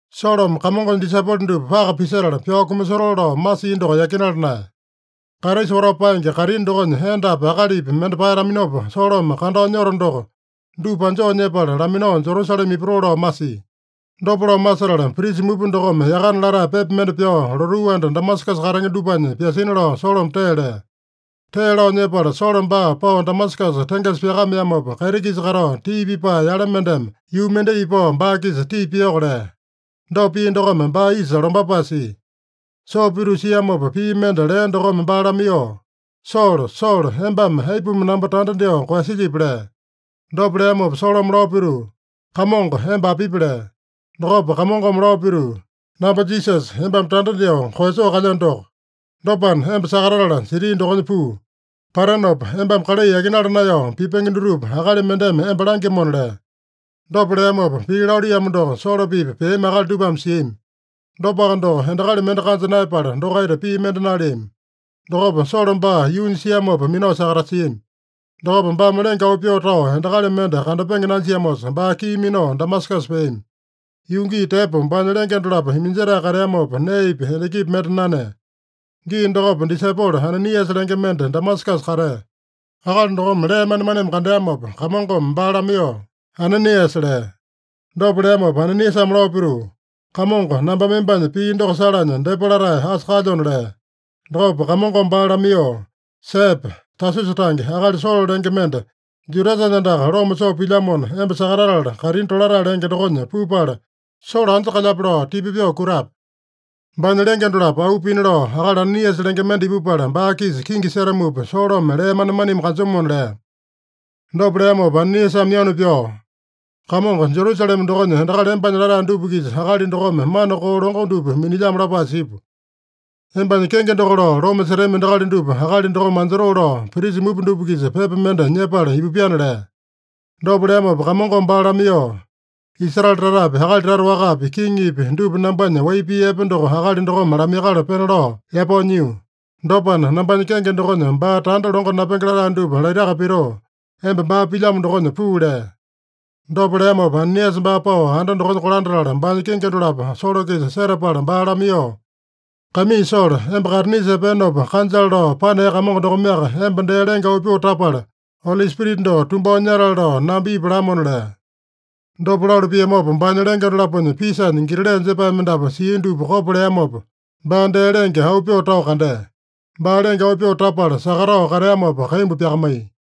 Solome Kamongonya disaipolo dupa paka pisetala, pyao kumasotoo lao masia doko yakinala naeya. Kraisa watao paenge kaitini dokonya endapi akalipi mende paeyataminopa, Solome kandao nyoto doko, dupa anjoo nyepala laminao Jerusalema ipatoo lao masia. Dopa lao masetala, prisa mupa dokome yakana latae pepa mende pyao, lotuu anda Damasakasa katenge dupanya pyasina lao Solome tee lea. Tee lao nyepala Solo baa pao Damasakasa tengesa pyakameamopa, kaiti-kisa katao tii pipae yale mendeme yuu mendai ipao baa-kisa tii piyoko lea. Dopa pia dokome, baa isa lombapae sia. Soo pituu siamopa pii mende lea dokome baa lamaiyoo, “Solo, Solo, embame aipuma namba tanda dyoo koeyasilyipi?” lea. Dopa leamopa Solome lao pituu, “Kamongo, emba apipi?” lea. Dokopa Kamongome lao pituu, “Namba Jisasa, embame tanda dyoo koeyasoo kalyeno doko. Dopana, emba sakatatala siti dokonya puu. Patenopa embame kalai yakinala naeyao pipenge dutupa akali mendeme emba langyamona” lea. Dopa leamopa, pii laluiyamo doko Solo-pipa peami akali dupame siami. Dopaka doko, endakali mende kanja naeyapala dokaita pii mende naleami. Dokopa Solo baa yuunya siamopa minao sakatasiami. Dokopa baame lenge auu pyoo tao endakali mende kandapenge nanjiamosa, baa kii minao Damasakasa peami. Yuu gii tepo baanya lenge dolapo iminjetae kateamopa, neepi endakipi mende nanea. Gii dokopa disaipolo Ananiasa lenge mende Damasakasa katea. Akali dokome lee manemaneme kandeamopa, Kamongome baa lamaiyoo, “Ananiasa!” lea. Dopa leamopa Ananiasame lao pituu, “Kamongo, nambame embanya pii doko salanya depa latae asa kalyona” lea. Dokopa Kamongome baa lamaiyoo, “Sepe! Tasusa tange akali Solo lenge mende, Judasanya andaka loma soo pilyamona, emba sakatatala, kaitini Tolatae lenge dokonya pupala, Solo anja kalyape lao tipa pyoo kutape. Baanya lenge dolapo auu pina lao, akali Ananiasa lenge mende ipupala, baa-kisa kingi setamupa Solome lee manemaneme kanjomona” lea. Dopa leamopa Ananiasame yanu pyao, “Kamongo, Jerusalema dokonya endakali embanya latae dupa-kisa akali dokome mana koo longo dupa minilyamo lapae sipu. Embanya kenge doko lao loma setami endakali dupa akali dokome anjotoo lao, prisa mupa dupa-kisa pepa mende nyepala ipupyana” lea. Dopa leamopa Kamongome baa lamaiyoo, “Israele tatapi, akali tata wakapi, kiŋipi dupa nambanya wai pii epe doko akali dokome lamaiyakala pena lao yapao nyio. Dopana, nambanya kenge dokonya baa tanda longo napenge latae dupa laitaka pitoo, emba baa pilyamo dokonya puu” lea. Dopa leamopa Ananiasa baa pao anda dokonya kolandatala, baanya kingi dolapo Solo-kisa setapala baa lamaiyoo, “Kaimii Solo, emba kaitinisa epeenopa kanjale lao panea Kamongo dokomeaka emba dee lenge auu pyoo tapala, Oli Spirita doko tumbao nyatale lao namba ipu lamona” lea. Dopa lalu piamopa, baanya lenge dolaponya pisanya grile jepae mendapu sia dupa kopo leamopa, baa dee lenge auu pyoo tao kandea. Baa lenge auu pyoo tapala sakatao kateamopa kaimbu pyakamaiya.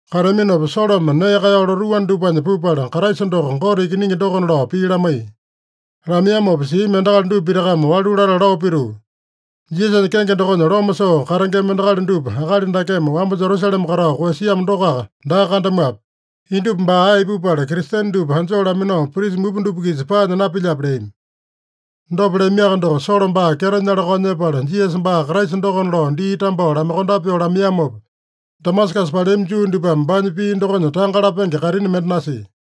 Kateaminopa Solome nee kaeyao lotuu anda dupanya pupala, Kraisa doko Gote Ikiningi dokona lao pii lamaiya. Lamaiyamopa siami endakali dupa pitakame walu latala lao pituu, “Jisasanya kenge dokonya loma soo katengema endakali dupa akali dakeme wamba Jerusalema katao koeyasiamo dokoaka daa kandamuape? Indupa baa ae ipupala, Kristene dupa anjoo laminao, prisa mupa dupa-kisa paanya napilyape?” leami. Dopa leamiaka doko, Solo baa kyeto nyala-kao nyepala, Jisasa baa Kraisa dokona lao dii tambao lamaiyokondape pyoo lamaiyamopa, Damasakasa paleami Juu dupame baanya pii dokonya tanga lapenge kaitini mende nasia.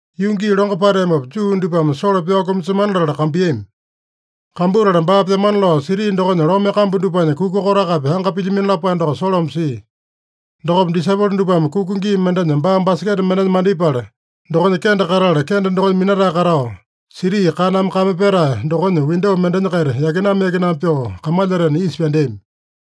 Yuu gii longo pateamopa, Juu dupame Solo pyao kumasemana latala kambuiyami. Kambutala baa pyamana lao, siti dokonya lome kambu dupanya kuka kotakapi anga pilyamino lapae doko Solome sia. Dokopa disaipolo dupame kuka gii mendenya baa baseketa mendenya mandipala, dokonya kende katatala, kende dokonya minatae katao, siti kaname kame petae dokonya windo mendenya-kaita yakinama-yakinama pyoo kamalyatena isa pyandeami.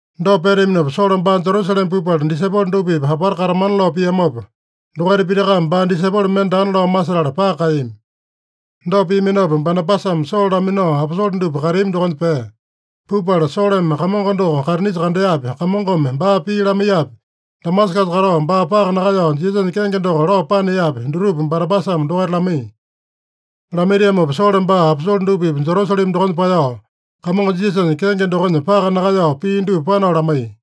Dopa peteaminopa Solo baa Jerusalema pupala, disaipolo dupa-pipa apata katamana lao piamopa, dokaita pitakame baa disaipolo mende daana lao masetala paka kaeyami. Dopa piaminopa Banabasame Solo laminao, aposole dupa kateami dokonya pea. Pupala, Solome Kamongo doko kaitinisa kandeapi, Kamongome baa pii lamaiyapi, Damasakasa katao baa paka nakaeyao Jisasanya kenge doko lao paneapi, dutupa Banabasame dokaita lamaiya. Lamaitiamopa, Solo baa aposole dupa-pipa Jerusalema dokonya paeyao, Kamongo Jisasanya kenge dokonya paka nakaeyao pii dupa panao lamaiya.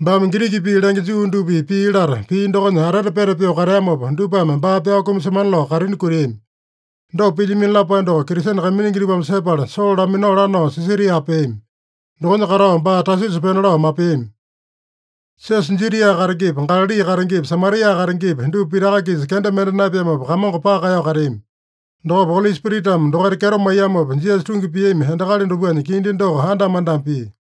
Baame Giriki pii lenge Juu dupa-pipa pii lata, pii dokonya atete peta pyoo kateamopa, dupame baa pyao kumasemana lao kaitini kutiami. Dopa pilyamino lapae doko Kristene kaiminingi dupame sepala, Solo laminao lanao Sisaria peami. Dokonya katao baa Tasusa pena lao mapeami. Siosa Judia katengepi, Galali katengepi, Samaria katengepi, dupa pitaka-kisa kenda mende naepeamopa, Kamongo paka kaeyao kateami. Dokopa Oli Spiritame dokaita kyeto maiyamopa, Jisasa tungi piami endakali dupanya kindi doko andama-andama pia.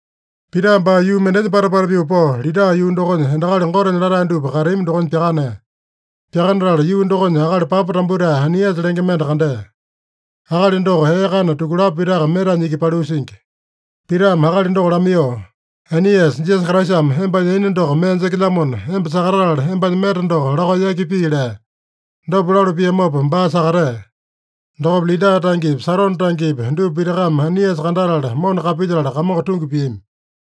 Pita baa yuu mendenya pata-pata pyoo pao, Lida yuu dokonya endakali Gotenya latae dupa kateami dokonya pyakanea. Pyakanatala yuu dokonya akali papa tambutae Ainiasa lenge mende kandea. Akali doko ee kana tukulapo pitaka metanya iki paliu singi. Pitame akali doko lamaiyoo, “Ainiasa, Jisasa Kraisame embanya yaina doko mee jekelyamona, emba sakatatala embanya meta doko lakao yaki pii” lea. Dopa lalu piamopa baa sakatea. Dokopa Lida tangepi, Sarone tangepi, dupa pitakame Ainiasa kandatala, mona kapilyetala, Kamongo tungi piami.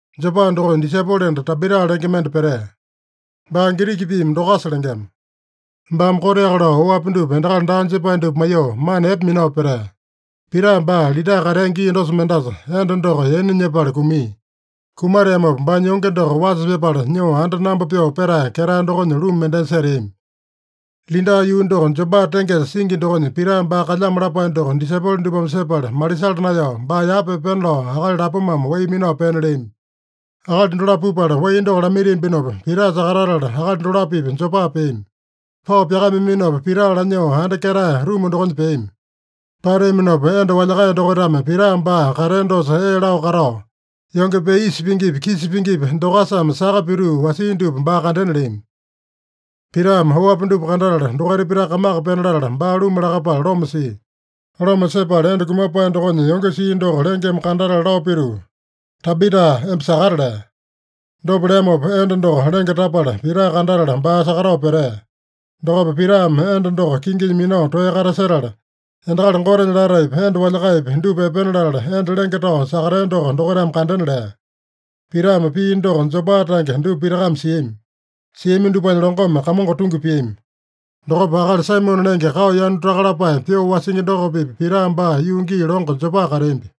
Jopa dokonya disaipolo enda Tabita lenge mende petea. (Baa Giriki piimi Dokasa lengema.) Baame koteaka lao oapi dupa endakali daa jepae dupa maiyoo, mana epe minao petea. Pita baa Lida katea gii dosa mendasa, enda doko yaina nyepala kumia. Kumateamopa baanya yonge doko wasa pyapala, nyoo anda namba pyoo petae ketae dokonya ruma mendenya seteami. Lida yuu doko Jopa tengesa singi dokonya Pita baa kalyamo lapae doko disaipolo dupame sepala, malisala naeyao, baa yapa epena lao akali lapomame wai minao pena leami. Akali dolapo pupala wai doko lamaitiambinopa, Pita sakatatala akali dolapo-pipa Jopa peami. Pao pyakameaminopa, Pita lanyoo anda ketae ruma dokonya peami. Pateaminopa, enda walyakae dokaitame Pita baa katea dosa ee lao katao, yonge pee isa pingipi, kisa pingipi, Dokasame saka pituu wasia dupa baa kandena leami. Pitame oapi dupa kandatala, dokaita pitaka kamaka pena latala, baa luma lakapala loma sia. Loma sepala, enda kumapae dokonya yonge sia doko lengeme kandatala lao pituu, “Tabita, emba sakata” lea. Dopa leamopa enda doko lenge tapala, Pita kandatala, baa sakatao petea. Dokopa Pitame enda doko kinginya minao toeya katasetala, endakali Gotenya lataepi, enda walyakaeyapi, dupa epena latala, enda lenge tao sakatea doko dokaitame kandena lea. Pitame pia doko Jopa tange dupa pitakame siami. Siami dupanya longome Kamongo tungi piami. Dokopa akali Saimone lenge, kao yanu taka lapae pyoo wasingi doko-pipa Pita baa yuu gii longo Jopa kateambi.